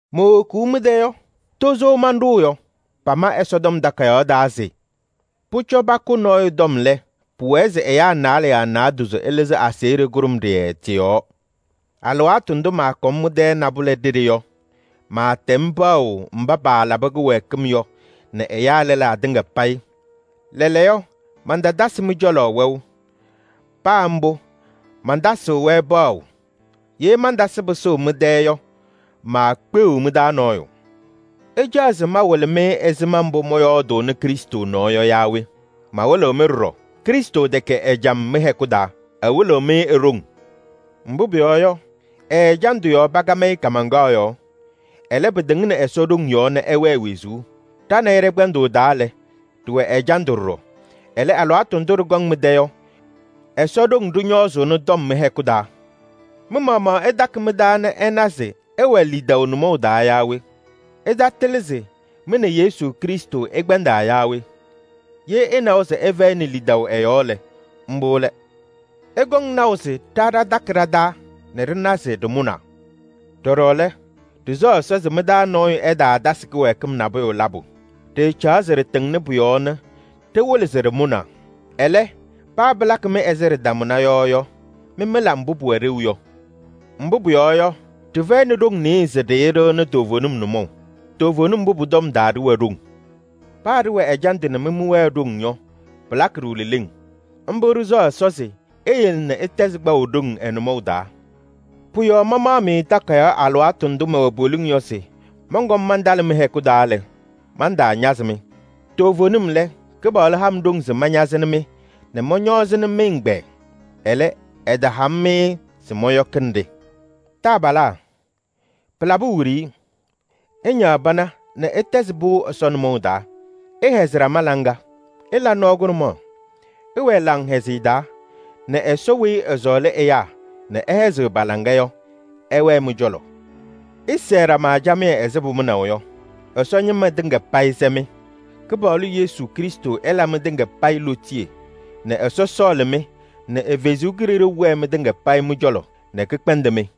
Mowokuu mɩ-tɛ yɔ, tozo manɖʋʋ yɔ. Pama Ɛsɔtɔm Takayaɣ taa se: “Pʋcɔ pakʋ nɔɔyʋ tɔm lɛ, pʋwɛɛ se ɛyaa naalɛ yaa naadozo ɩlɩzɩ aseɣɖe kʋɖʋmɖɩyɛ tɩ-yɔɔ.” Alɩwaatʋ ndʋ maakɔm mɩ-tɛ nabʋlɛ ɖeɖe yɔ, maatɛm paɣʋ mba paalabɩ kɩwɛɛkɩm yɔ nɛ ɛyaa lɛlaa tɩŋa payɩ. Lɛɛlɛɛyɔ mantatasɩ mɩ-cɔlɔ wɛʋ, paa mbʋ mantasɩɣ-wɛ paɣʋ. Ye mantasɩ pɩsʋʋ mɩ-tɛ yɔ, maasɔŋ mɩ-taa nɔɔyʋ. Ɩcaɣ se mawɩlɩ-mɩ ɛzɩma mbʋ mɔyɔɔdʋʋnɩ Krɩstʋ nɔɔ yɔ yaa we? Mawɩlɩɣ-mɩ ɖɔɖɔ. Krɩstʋ tɛkɛ ɛjam mɩ-hɛkʋ taa: ɛwɩlɩɣ-mɩ e-ɖoŋ. Mbʋ pʋyɔɔ yɔ, ɛ-ɛjandʋ yɔɔ pakam-ɩ kaamaŋkaɣ yɔɔ. Ɛlɛ, pɩtɩŋnɩ Ɛsɔ ɖoŋ yɔɔ nɛ ɛwɛɛ wezuu. Ɖa nɛ ɩ ɖɛ-kpɛndʋʋ taa lɛ, ɖɩwɛ ɛjandʋ ɖɔɖɔ. Ɛlɛ, alɩwaatʋ ndʋ ɖɩkɔŋ mɩ-tɛ yɔ, Ɛsɔ ɖoŋ ɖɩñɔɔzʋʋnɩ tɔm mɩ-hɛkʋ taa. Mɩ-maɣmaɣ ɩtakɩ mɩ-taa nɛ ɩna se ɩwɛ lidaʋ nʋmɔʋ taa yaa we? Ɩtatɩlɩ se mɩ nɛ Yesu Krɩstʋ ɩkpɛndaa yaa we? Ye ɩnawa se ɩfɛyɩnɩ lidaʋ ɛ-yɔɔ lɛ, mbʋ lɛ. Ɩkɔŋ naʋ se ɖa ɖatakɩ ɖa-taa nɛ ɖɩna se ɖɩmʋnaa. Ɖɔɖɔ lɛ, ɖɩsɛɣ Ɛsɔ se mɩ-taa nɔɔyʋ ɛtaatasɩ kɩwɛɛkɩm nabʋyʋ labʋ. Ɖɩɩcaɣ se ɖɩtɩŋnɩ pʋ-yɔɔ nɛ ɖɩwɩlɩ se ɖɩmʋnaa. Ɛlɛ, paa pɩlakɩ-mɩ ɛzɩ ɖɩtamʋna yɔ yɔ, mɩ mɩla mbʋ pʋwɛ ɖeu yɔ. Mbʋ pʋyɔɔ yɔ, ɖɩfɛyɩnɩ ɖoŋ nɩɩyɩ se ɖɩɩɖɩɣnɩ toovenim nʋmɔʋ. Toovenim mbʋ pʋ-tɔm taa ɖɩwɛ ɖoŋ. Paa ɖɩwɛ ɛjandʋ nɛ mɩ mɩwɛɛ ɖoŋ yɔ, pɩlakɩ-ɖʋ leleŋ. Mbʋ ɖɩsɛɣ Ɛsɔ se eyele nɛ ɩtɛzɩ kpaʋ ɖoŋ ɛ-nʋmɔʋ taa. Pʋ-yɔɔ mamaɣ-mɩ takayaɣ alɩwaatʋ ndʋ mɛwɛ poliŋ yɔ se mɔnkɔm mantalɩ mɩ-hɛkʋ taa lɛ, mantaañazɩ-mɩ. Toovenim lɛ, Kɩpaɣlʋ ha-m ɖoŋ se mañazɩnɩ-mɩ nɛ mɔñɔɔzɩnɩ mɩ-ɛgbɛyɛ. Ɛlɛ, ɛtaha-m-ɩ se mɔyɔkɩnɩ-ɖɩ. Taabalaa, pɩlabɩ wiɖiyi! Ɩñaɣ pana nɛ ɩtɛzɩ pɩʋ Ɛsɔ nʋmɔʋ taa. Ɩhɛzɩ ɖama laŋa. Ɩla nɔɔ kʋɖʋmaɣ. Ɩwɛɛ laŋhɛzɩyɛ taa nɛ Ɛsɔ weyi ɛsɔɔlɩ ɛyaa nɛ ɛhɛzɩɣ pa-laŋa yɔ, ɛwɛɛ mɩ-cɔlɔ. Ɩsɛɛ ɖama camɩyɛ ɛzɩ pʋmʋnaʋ yɔ. Ɛsɔ ñɩma tɩŋa payɩ sɛ-mɩ. Kɩpaɣlʋ Yesu Krɩstʋ ɛla mɩtɩŋa payɩ lootiye nɛ Ɛsɔ sɔɔlɩ-mɩ nɛ ɛ-Kalɩzaɣ wɛɛ mɩtɩŋa payɩ mɩ-cɔlɔ nɛ kɛkpɛndɩ-mɩ.